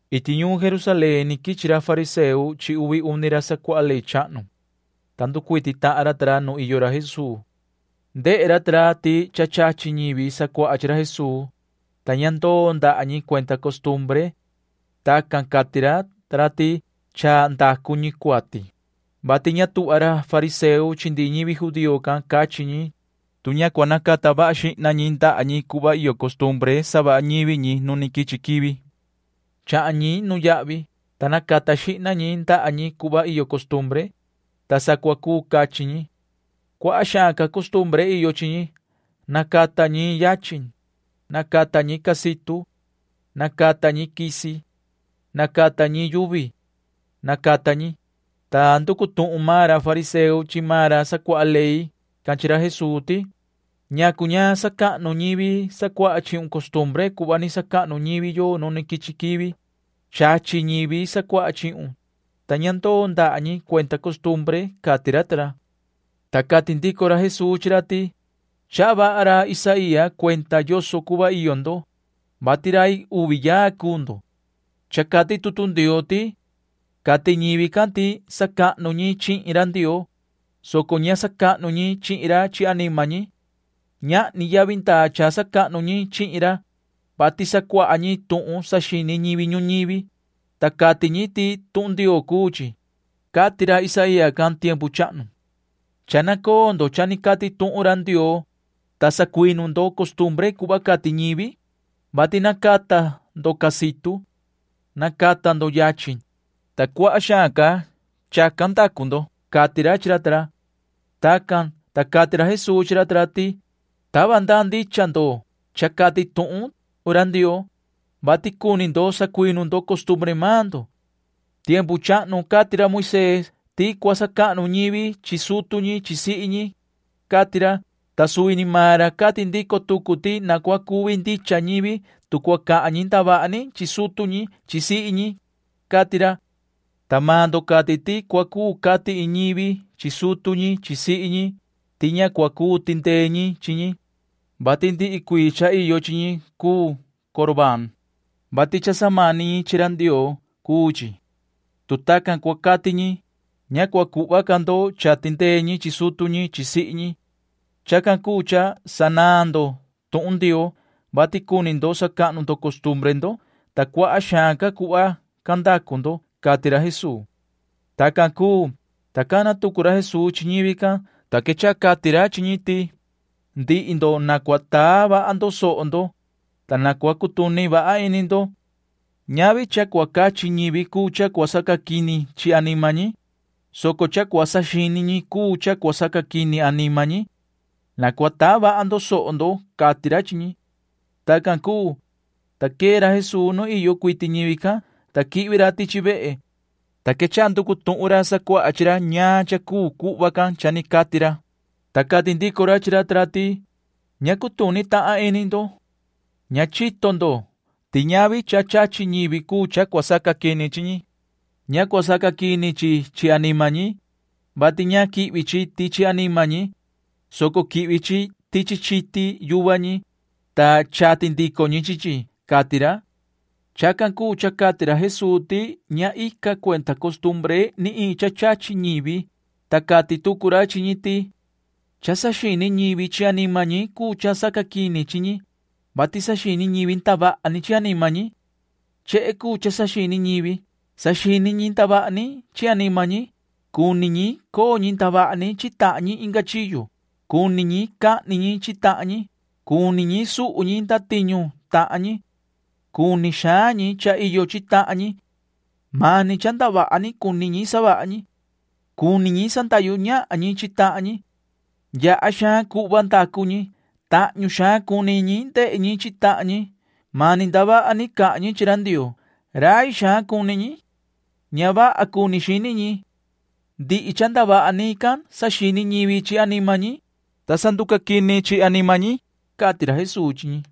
Iti ñuun Jerusalén ni quichi ra fariseo chi uvi uni ra sacuaha ley chahnu, ta nducuiti tahan ra ta ra nu iyo ra Jesuu. Ndehe ra ta ra ti cha chachi ñivi sacuaha chi ra Jesuu, ta ña ndoo ndaha ñi cuenda costumbre. Tacan cati ra ta ra ti cha ndacu ñi cuati, vati ña tuhva ra fariseo chi ndihi ñivi judío can cachi ñi, tu ña cua nacata vaha xihna ñi ndaha ñi cuhva iyo costumbre savaha ñivi ñi nu ni quichi quivi. Chahan ñi nuyahvi, ta nacata xihna ñi ndaha ñi cuhva iyo costumbre, ta sa cua cuu cachi ñi. Cuaha xaan ca costumbre iyo chi ñi. Nacata ñi yachin. Nacata ñi casitu. Nacata ñi quisi. Nacata ñi yuvi. Nacata ñi, ta nducu tuhun maan ra fariseo chi maan ra sacuaha ley can chi ra Jesuu ti: ―¿Ñacu ña sacahnu ñivi sacuaha chihun costumbre cuhva ni sacahnu ñivi yo nu ni quichi quivi? Chachi ñivi sacuaha chihun, ta ña ndoo ndaha ñi cuenda costumbre ―cati ra ta ra. Ta cati ndico ra Jesuu chi ra ti: ―Chaha vaha ra Isaía cuenda yoso cuhva iyo ndo, vati rai uvi yaa cuu ndo. Cha cati tutu Ndioo ti: Cati ñivi can ti cha sacahnu ñi chihin ra Ndioo, soco ña sacahnu ñi chihin ra chi anima ñi. Ñahni yavi ndaa cha sacahnu ñi chihin ra, vati sacuaha ñi tuhun cha saxini ñivi ñuñivi, ta cati ñi ti tuhun Ndioo cuu chi, cati ra Isaía can tiempu chahnu. Cha nacoo ndo cha ni cati tuhun ra Ndioo, ta sacuinu ndo costumbre cuhva cati ñivi, vati nacata ndo casitu. Nacata ndo yachin, ta cuaha xaan ca chacan ndacu ndo ―cati ra chi ra ta ra. Tacan, ta cati ra Jesuu chi ra ta ra ti: ―Tava ndaa ndicha ndo cha cati tuhun ra Ndioo, vati cuni ndo sacuinu ndo costumbre maan ndo. Tiempu chahnu cati ra Moisee ti cua sacahnu ñivi chi sutu ñi chi sihi ñi, cati ra, ta suvi ni maan ra cati ndico tucu ti na cua cuvi ndicha ñivi tu cua cahan ñi ndavaha ni chi sutu ñi chi sihi ñi, cati ra, ta maan ndo cati ti cua cuu cati iin ñivi chi sutu ñi chi sihi ñi ti ña cua cuu tindee ñi chi ñi, vati ndihi cuii cha iyo chi ñi cuu Corbaan, vati cha samani ñi chi ra Ndioo cuu chi. Tu tacan cua cati ñi, ña cua cuhva ca ndo cha tindee ñi chi sutu ñi chi sihi ñi. Chacan cuu cha sanaan ndo tuhun Ndioo, vati cuni ndo sacahnu ndo costumbre ndo, ta cuaha xaan cuhva can ndacu ndo ―cati ra Jesuu. Tacan cuu, ta cana tucu ra Jesuu chi ñivi can, ta quechaha cati ra chi ñi ti: ―Ndihi ndo na cua taa vaha ndo soho ndo, ta na cua cutuni vaha ini ndo. Ñahni cha cua cachi ñivi cuu cha cua sacaquini chi anima ñi, soco cha cua saxini ñi cuu cha cua sacaquini anima ñi. Na cua taa vaha ndo soho ndo ―cati ra chi ñi. Tacan cuu, ta quee ra Jesuu nu iyo cuiti ñivi can, ta quihvi ra tichi vehe, ta quechaha nducu tuhun ra sacuaha chi ra ñaan cha cuu cuhva can cha ni cati ra, ta cati ndico ra chi ra ta ra ti: ―Ña cutuni tahan ini ndo. Ña chito ndo ti ñahni cha chachi ñivi cuu cha cua sacaquini chi ñi. Ña cua sacaquini chi chi anima ñi, vati ña quihvi chi tichi anima ñi, soco quihvi chi tichi chiti yuva ñi, ta chati ndico ñi chi chi ―cati ra. Chacan cuu cha cati ra Jesuu ti ña ica cuenda costumbre ni iin cha chachi ñivi, ta cati tucu ra chi ñi ti: ―Cha saxini ñivi chi anima ñi cuu cha sacaquini chi ñi, vati saxini ñivi ndavaha ni chi anima ñi. Chehe cuu cha saxini ñivi. Saxini ñi ndavaha ni chi anima ñi. Cuni ñi coo ñi ndavaha ni chi tahan ñi inga chiyo. Cuni ñi cahni ñi chi tahan ñi. Cuni ñi suhu ñi ndatiñu tahan ñi. Cuni xaan ñi cha iyo chi tahan ñi. Mani cha ndavaha ni cuni ñi savaha ñi. Cuni ñi sandahyu ñahan ñi chi tahan ñi. Yaha xaan cuhva cha ndacu ñi. Tahñu xaan cuni ñi ndehe ñi chi tahan ñi. Mani ndavaha ni cahan ñi chi ra Ndioo. Rai xaan cuni ñi. Ña vaha cuni xini ñi. Ndihi cha ndavaha ni can saxini ñivi chi anima ñi, ta sa nducaquini anima ñi ―cati ra Jesuu chi ñi.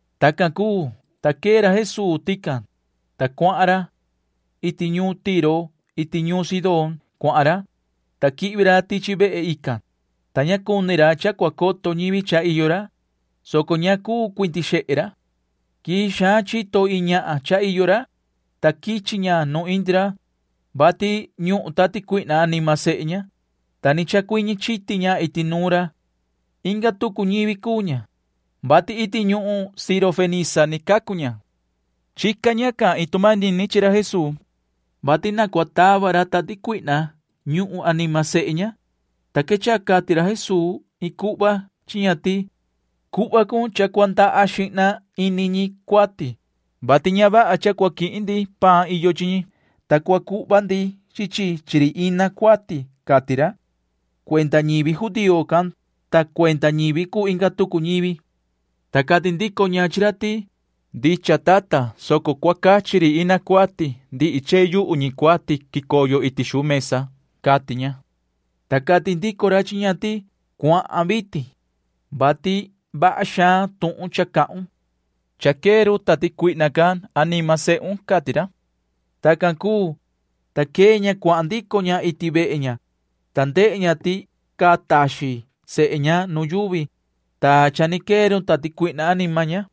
Tacan cuu, ta quee ra Jesuu tican, ta cuahan ra. Iti ñuun Tiro iti ñuun Sidón cuahan ra, ta quihvi ra tichi vehe ican, ta ña cuni ra cha cua coto ñivi cha iyo ra, soco ña cuu cuindi xehe ra. Quii xaan chito iin ñahan cha iyo ra, ta quichi ña nu indi ra, vati ñuhun tati cuihna anima sehe ña, ta ni chacuiñi chiti ña iti nuun ra. Inga tucu ñivi cuu ña, vati iti ñuhun sirofenisa ni cacu ña. Chica ñacan iin tu manini chi ra Jesuu, vati na cua tava ra tati cuihna ñuhun anima sehe ña, ta quechaha cati ra Jesuu [iin cuhva] chi ña ti: ―Cuhva cun cha cua ndaha xihna ini ñi cuati, vati ña vaha cha cua quihin ndi paan iyo chi ñi, ta cua cuhva ndi chi chi chi ri ina cuati ―cati ra [cuenda ñivi judío can ta cuenda ñivi cuu inga tucu ñivi]. Ta cati ndico ña chi ra ti: ―Ndicha, tata, soco cua cachi ri ina cuati ndihi chehe yuhu ñi cuati quicoyo iti xuu mesa ―cati ña. Ta cati ndico ra chi ña ti: ―Cuahan vitin, vati vaha xaan tuhun cha cahun. Cha quee run tati cuihna can anima sehun ―cati ra. Tacan cuu, ta quee ña cuahan ndico ña iti vehe ña, ta ndehe ña ti caa taxin sehe ña nu yuvi, ta cha ni quee run tati cuihna anima ña.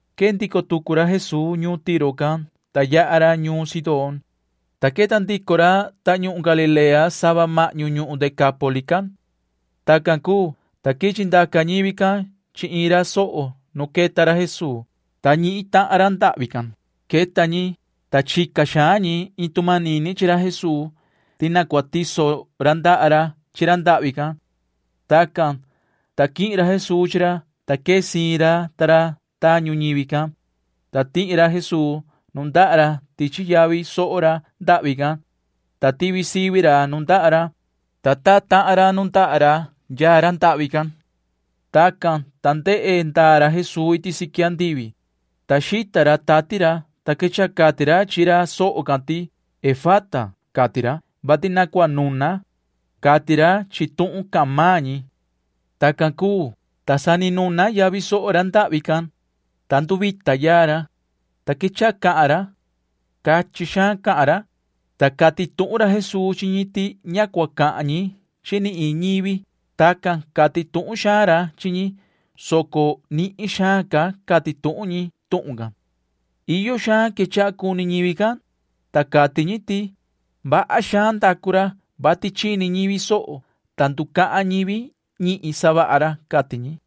Quee ndico tucu ra Jesuu ñuun Tiro can, ta yaha ra ñuun Sidón, ta queta ndico ra tañuhun Galilea sava mahñu ñuhun Decápoli can. Tacan cuu, ta quichi ndaca ñivi can chi iin ra soho nu queta ra Jesuu, ta ñihin tahan ra ndahvi can. Queta ñi, ta chica xaan ñi iin tu manini chi ra Jesuu ti na cua tiso ra ndaha ra chi ra ndahvi can. Tacan, ta quihin ra Jesuu chi ra, ta quee siin ra ta ra tañu ñivi can, ta tihi ra Jesuu nundaha ra tichi yavi soho ra ndahvi can, ta tivi sivi ra nundaha ra, ta taa tahan ra nundaha ra yaa ra ndahvi can. Tacan, ta ndehe ndaa ra Jesuu iti siqui andivi, ta xita ra tati ra, ta quechaha cati ra chi ra soho can ti: ―¡Efata! ―cati ra, vati na cua nuna, cati ra chi tuhun cahan maan ñi. Tacan cuu, ta sa ni nuna yavi soho ra ndahvi can, ta nduvita yaa ra, ta quechaha cahan ra. Cachin xaan cahan ra, ta cati tuhun ra Jesuu chi ñi ti ña cua cahan ñi chi ni iin ñivi. Tacan cati tuhun xaan ra chi ñi, soco nihin xaan ca cati tuhun ñi tuhun can. Iyo xaan quechaha cuni ñivi can, ta cati ñi ti: ―Vaha xaan ndacu ra, vati chini ñivi soho, ta nducahan ñivi ñihin savaha ra ―cati ñi.